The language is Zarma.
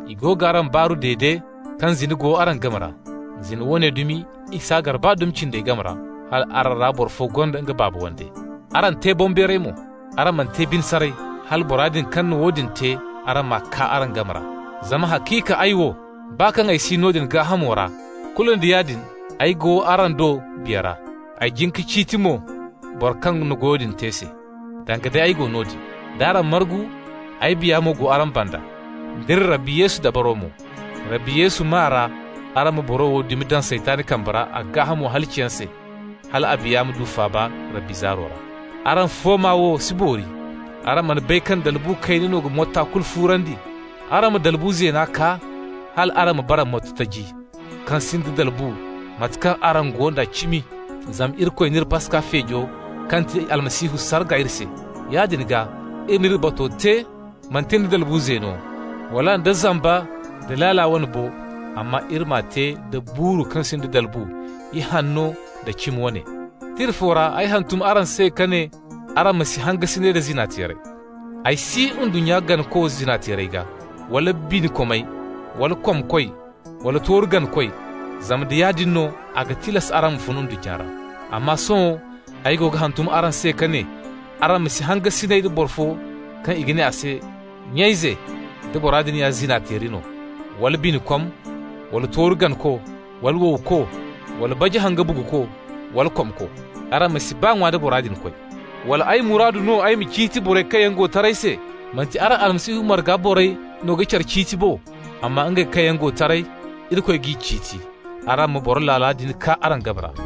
I go g'araŋ baaru dede kaŋ zina go araŋ game ra. Zina woone dumi i s'a gar baa dumi cindey game ra, hal araŋ boro fo gonda nga baaba wande. Araŋ te boŋbeeray mo! Araŋ mana te bine saray, hala bora din kaŋ na woodin te, araŋ m'a kaa araŋ game ra. Zama haciika ay wo, baa kaŋ ay si noodin gaahamo ra, kulu nda yaadin ay go araŋ do biya ra. Ay jin ka ciiti mo bora kaŋ na goyo din te se, danga day ay go noodin no. D'araŋ margu, ay biya mo go araŋ banda, d'iri Rabbi Yesu dabaro mo. Rabbi Yesu maa ra araŋ ma boro wo dumi daŋ Saytan kambe ra a gaahamo halaciyaŋ se, hal a biya ma du faaba Rabbi zaaro ra. Araŋ fooma wo si boori! Araŋ mana bay kaŋ dalbu kayna no ga motta kulu fuurandi? Araŋ ma dalbu zeena kaa, hal araŋ ma bara motto taji, kaŋ sinda dalbu, mate kaŋ araŋ go nda cimi. Zama Irikoy n'iri Paska feejo, kaŋ ga ti Almasihu, sarga iri se. Yaadin gaa, iri m'iri bato te, manti nda dalbu zeeno, wala nda zamba nda laala wane bo, amma iri m'a te da buuru kaŋ sinda dalbu, ihanno nda cimi wane. Tira fo ra ay hantum araŋ se ka ne araŋ ma si hangasinay da zina-teerey. Ay si ndunnya ganako zina-teerey gaa, wala binikomey, wala komkoy, wala tooru ganakoy, zama nda yaadin no, a ga tilas araŋ ma fun ndunnya ra. Amma sohõ ay go ga hantum araŋ se ka ne araŋ ma si hangasinay da boro fo kaŋ i ga ne a se nya-ize, da bora din ya zina-teeri no, wala binikom, wala tooru ganako, wala wowko, wala baji-haŋ-ka-buguko, wala komko. Araŋ ma si baa ŋwa da bora din koy. Wala ay muraadu no ay ma ciiti borey kaŋ yaŋ go taray se? Manti araŋ Almasihu marga borey no ga care ciiti bo? Amma ngey kaŋ yaŋ go taray, Irikoy g'i ciiti. Araŋ ma boro laala din kaa araŋ game ra.